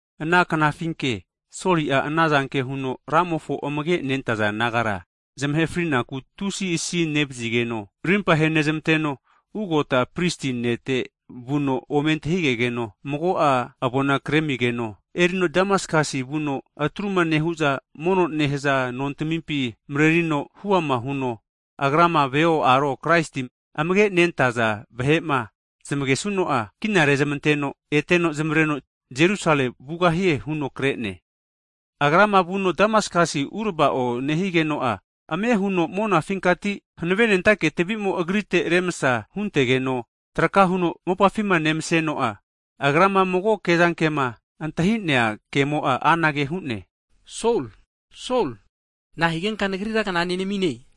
Ana knafinke Soli'a ana zanke huno Ramofo amage' nentaza disaipol nagara zamahe frinaku tusi asi nevazigeno, rimpa henezmanteno, ugota prisi nete vuno, ome antahigegeno mago'a avona kremigeno erino Damaskasi vuno atruma nehu'za mono nehaza nontamimpi (sinagogs) marerino huama huno, agrama veo, aro Kraisti amage' nentaza vahe'ma zamagesuno'a, kina rezmanteno eteno zamareno Jerusale vugahie huno kre'ne. Agrama vuno Damaskasi urava'o nehigeno'a, ame huno monafinkati hanavenentake tavi'mo agrite remsa huntegeno, traka huno mopafima nemseno'a, agrama mago kezankema antahi'nea kemo'a anage hu'ne, Sol! Sol! Na'a higenka Nagrira kna nenamine?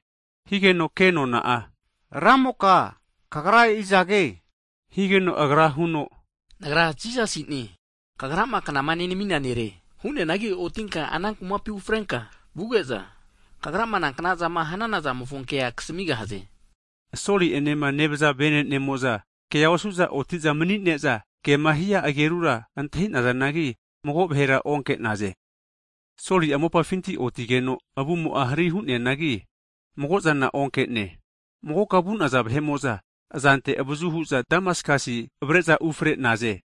Higeno kenona'a, Ramoka, Kagra izage? huno higeno, Agra huno, Nagra Jisasine, kagrama knama nenamina Nere. Hu'neanagi otinka ana kumapi ufrenka vuge'za, kagrama nankna'zama hanana zamofo kea kasmigahaze. Soli enema nevaza vene'nemo'za kea osu'za oti'za mani'ne'za, kema hia agerura antahi'nazanagi, mago vahera onke'naze. Soli'a mopafinti otigeno, avumo'a hari hu'neanagi, mago'zana onke'ne. Magoka vu'naza vahe'mo'za azante avazu hu'za Damaskasia avare'za ufare'naze.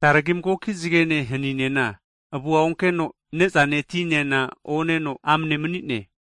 Taregi magoki zagene haninena, avua onkeno ne'zane, ti'nena oneno amane mani'ne.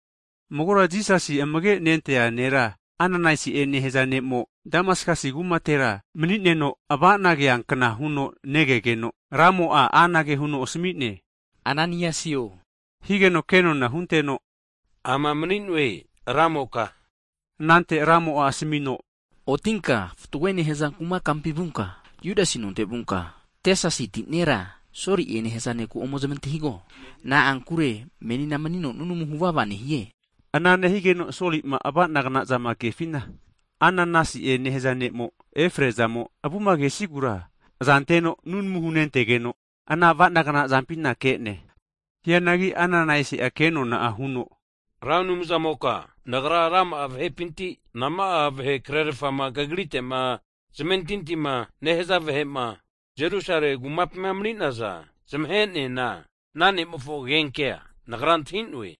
Magora Jisasi amage' nentea nera, Ananaiasi'e nehaza ne'mo Damaskasi kumatera mani'neno, ava'na keankna huno negegeno, Ramo'a anage huno asami'ne, Ananaisi'o! Higeno ke nona hunteno, ama mani'noe Ramoka. Anante Ramo'a asamino, otinka fatgoe nehaza kuma kampi vunka, Judasi nonte vunka, Tesasiti nera, Soli'e nehaza neku ome zamantahigo, na'ankure menina manino nunamu huvava nehie. Ana nehigeno Soli'ma ava'nagna'zama kefina, Ananaisi'ema nehaza ne'mo efrea zamo avuma kesigura azanteno nunamu hunentegeno, ana avanagnazampina ke'ne. Hianagi Ananaisi'a ke'nona'a huno, Ra Anumzamoka nagra rama'a vahepinti, nama'a vahe krerafama Kagrite'ma zamentintima nehaza vahe'ma Jerusale kumapima mani'naza zamahe'neana ana ne'mofo agenkea nagra antahi'noe.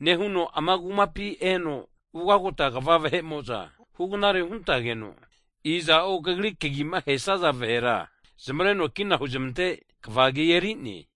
Nehuno ama kumapi eno, ugagota kva (hai pris) vahe'mo'za hugnare huntageno, iza'o Kagri kagima ahesaza vahera zamareno kina huzamante kva agi eri'ne.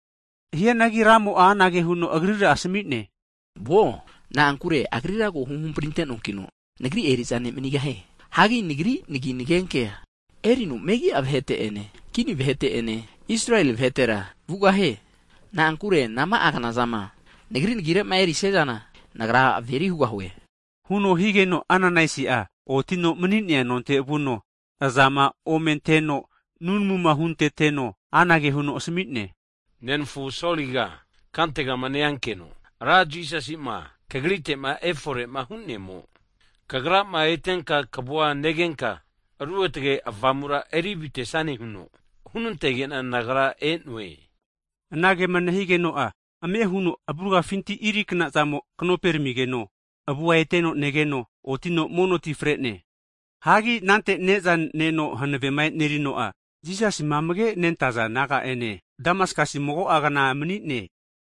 Hianagi Ramo'a anage huno agrira asami'ne, Vuo, na'ankure agrira ko huhampri ante'noakino, Nagri eri'za ne' manigahie. Hagi Nagri nagi nagenkea erino megi'a vahete'ene, kini vahete'ene, Israeli vahetera vugahie. Na'ankure nama'a kna'zama Nagri nagire'ma eri'sia zana, Nagra averi hugahue. Huno higeno, Ananaisi otino mani'nea nonte vuno, azama omenteno nunamuma hunteteno anage huno asami'ne, nenafu Soliga, kantegama neankeno, Ra Jisasi'ma kagrite efore'ma hu'nemo, kagrama etenka kavu negenka, Ruotge Avamura eri avitesane huno hunantege'na nagra e'noe. Anagema nehigeno'a, ame huno avuragafinti irikna'zamo knope ramigeno, avua eteno negeno otino mono ti fre'ne. Hagi anante ne'za neno hanavema e'nerino'a, Jisasima amage' nentaza disaipol naga'ene Damaskas mago'a kna mani'ne.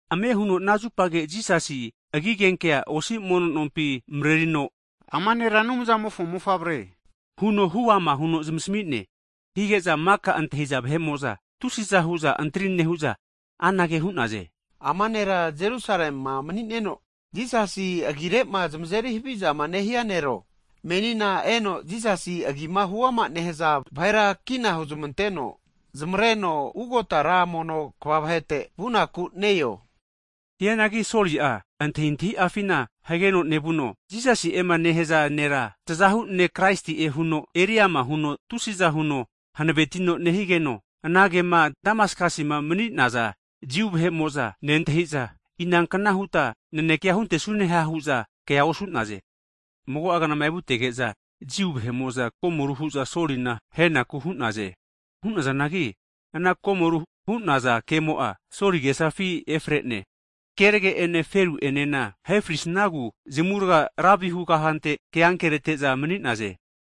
Ame huno, ana zupage Jisasi agigenkea osi mono nompi marerino, ama Nera Anumzamofo Mofavre huno huama huno zamasmi'ne. Hige'za maka antahiza vahe'mo'za tusiza hu'za antri nehu'za, anage hu'naze, Ama'na nera Jerusalema mani'neno, Jisasi agire'ma zamazeri havizama nehia nero? Menina eno Jisasi agima huama nehaza vahera kina huzamanteno zamareno ugota ra mono (hetprisi) kva vahete vunaku ne-eo? Hu'naze. Hianagi Soli'a, antahintahi'afina hageno nevuno Jisasi'ema nehaza nera tazahu ne' Kraisi'e huno eri ama huno tusiza huno hanavetino nehigeno, ana kema Damaskasima mani'naza Jiu vahe'mo'za, nentahiza inankna huta nanekea huntesune ha hu'za kea osu'naze. Mago'a knama evutege'za, Jiu vahe'mo'za komoru hu'za Solina ahenaku hu'naze. Hu'nazanagi ana komoru hu'naza kemo'a Soli agesafi efre'ne. Zgene haninena ahe fri'snagu zamurga ra vihu kafante ke ankerete'za mani'naze.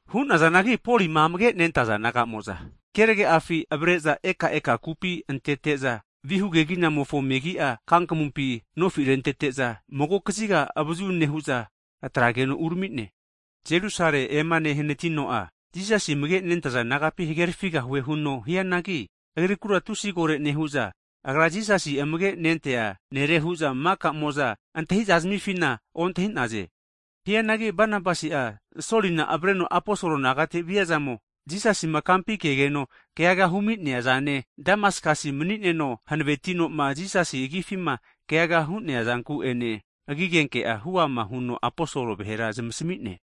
Hu'nazanagi, Polima amage'nentaza disaipol nagamo'za kerage'afi avare'za eka eka kupi antete'za, kumamofo vihu keginamofo megi'a kankamumpi nofi rentete'za mago kaziga avazu nehu'za atrageno urami'ne. Jerusale ema nehanatino'a, Jisasi amage nentaza disaipol nagapi hagerafigahue huno hianagi, agrikura tusi kore nehu'za agra Jisasi amage' nentea nere hu'za maka'mo'za antahi'za zamifina ontahi'naze. Hianagi Banabasi'a, Solina avareno aposol nagate viazamo, Jisasima kampi kegeno keaga humi'neazane, Damaskas mani'neno hanavetino'ma Jisasi agifima keaga hu'neazanku ene, agigenke'a hu'ama huno aposol vahera zamasmi'ne.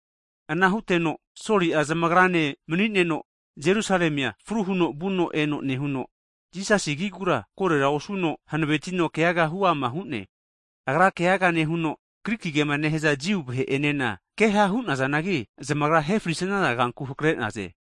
Ana huteno Soli'a zamagrane mani'neno, Jerusalemia fru huno vuno eno huno, Jisasi agigura korera osuno hanavetino keaga huama hu'ne. Agra keaga nehuno, Griki kema nehaza Jiu vahe'enena, keha hu'nazanagi, zamagra ahe frisnaza kanku hakare'naze.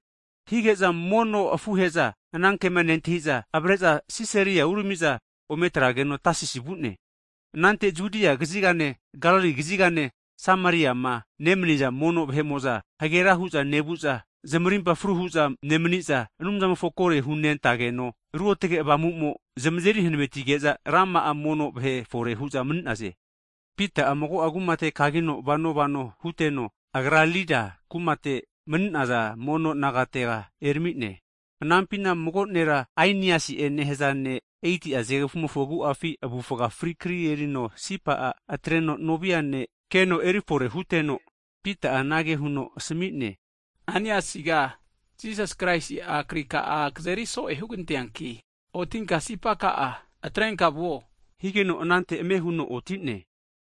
Hige'za mono afuhe'za anankema nentahi'za, avare'za Sisaria urami'za ometrageno Tasisi vu'ne. Anante Judia kazigane Galili kazigane Sameriama nemaniza mono vahe'mo'za, hagera hu'za nevu'za zamarimpa fru hu'za nemani'za, Anumzamofonku kore hunentageno, Ruotge Avamu'mo zamazeri hanavenetige'za, rama'a mono vahe fore hu'naze. Pita'a mago'a kumate kagino vano vano huteno, agra Lida kumate mani'naza (saints) mono nagatega erami'ne. Anampina mago nera Ainiasi'e nehaza ne' 8ti'a zgegfu'mofo agu'afi avufa fri kri erino sipa'a atreno novia ne' keno erifore huteno, Pita'a anage huno asami'ne, Ainiasiga, Jisas Kraisi'a krika'a kazeri so'e huganteanki, otinka tafeka'a atrenka vuo, higeno anante ame huno oti'ne.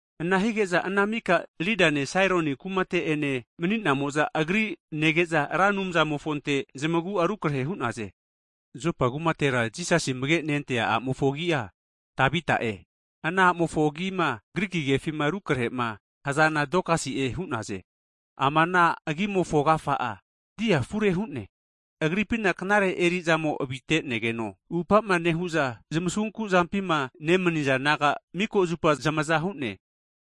Ana hige'za ana mika Lidane, Saroni kumate ene mani'namo'za agri nege'za, Ra Anumzamofonte zamagu'a rukarehe hu'naze. Jopa kumatera Jisasi amage nentea a'mofo agi'a Tavita'e. Ana a'mofo agima (Griki kefi eri rukarehe'ma hazana Dokasi'e hu'naze. Ama ana agimofo agafa'a, dia afure hu'ne) agripina knare eri'zamo avite'negeno upa'ma nehu'za zamasunku zampima nemaniza naga miko zupa zamaza hu'ne.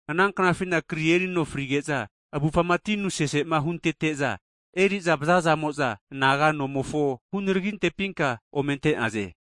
Ananknafina kri erino fri'geno, avufama tinu sesema huntete'za eri'za vazazamo'za, anaga nomofo hunaragintepinka ome ante'naze.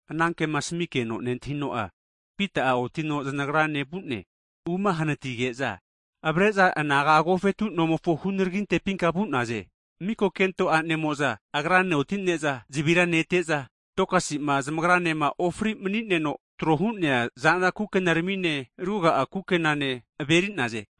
Anankema asamikeno nentahino'a, Pita'a otino zanagrane vu'ne. Uma hanatige'za, avare'za anaga agofetu nomofo hunaragintepinka vu'naze. Miko kento a'nemo'za agrane oti'ne'za, zavira nete'za Dokasi'ma zamagranema ofri mani'neno tro hu'nea zanra kukenarami'ne, ruga'a kukenane averi'naze.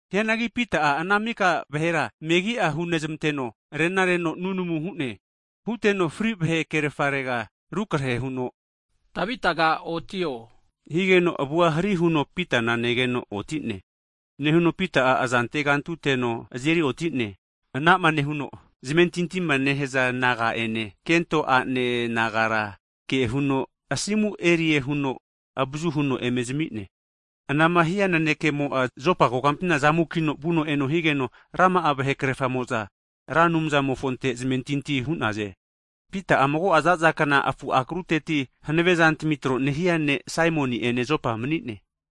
Hianagi Pita'a ana mika vahera megi'a hunezmanteno, rena reno nunamu hu'ne. Huteno fri vahe kerafarega rukarehe huno, Tabitaga otio! Higeno avua hari huno, Pitana negeno oti'ne. Nehuno Pita'a aza antegantuteno azeri oti'ne. Anama nehuno zamentintima nehaza naga'ene, kento a'ne nagara kehuno asimu erie huno avazu huno eme zami'ne. Anama hia nanekemo'a Jopa kokampina zamukino vuno eno higeno, rama'a vahe krerfamo'za Ra Anumzamofonte zamentinti hu'naze. Pita'a mago'a zaza kna, afu akruteti hanave'zantami tro nehia ne' Saimoni'ene Jopa mani'ne.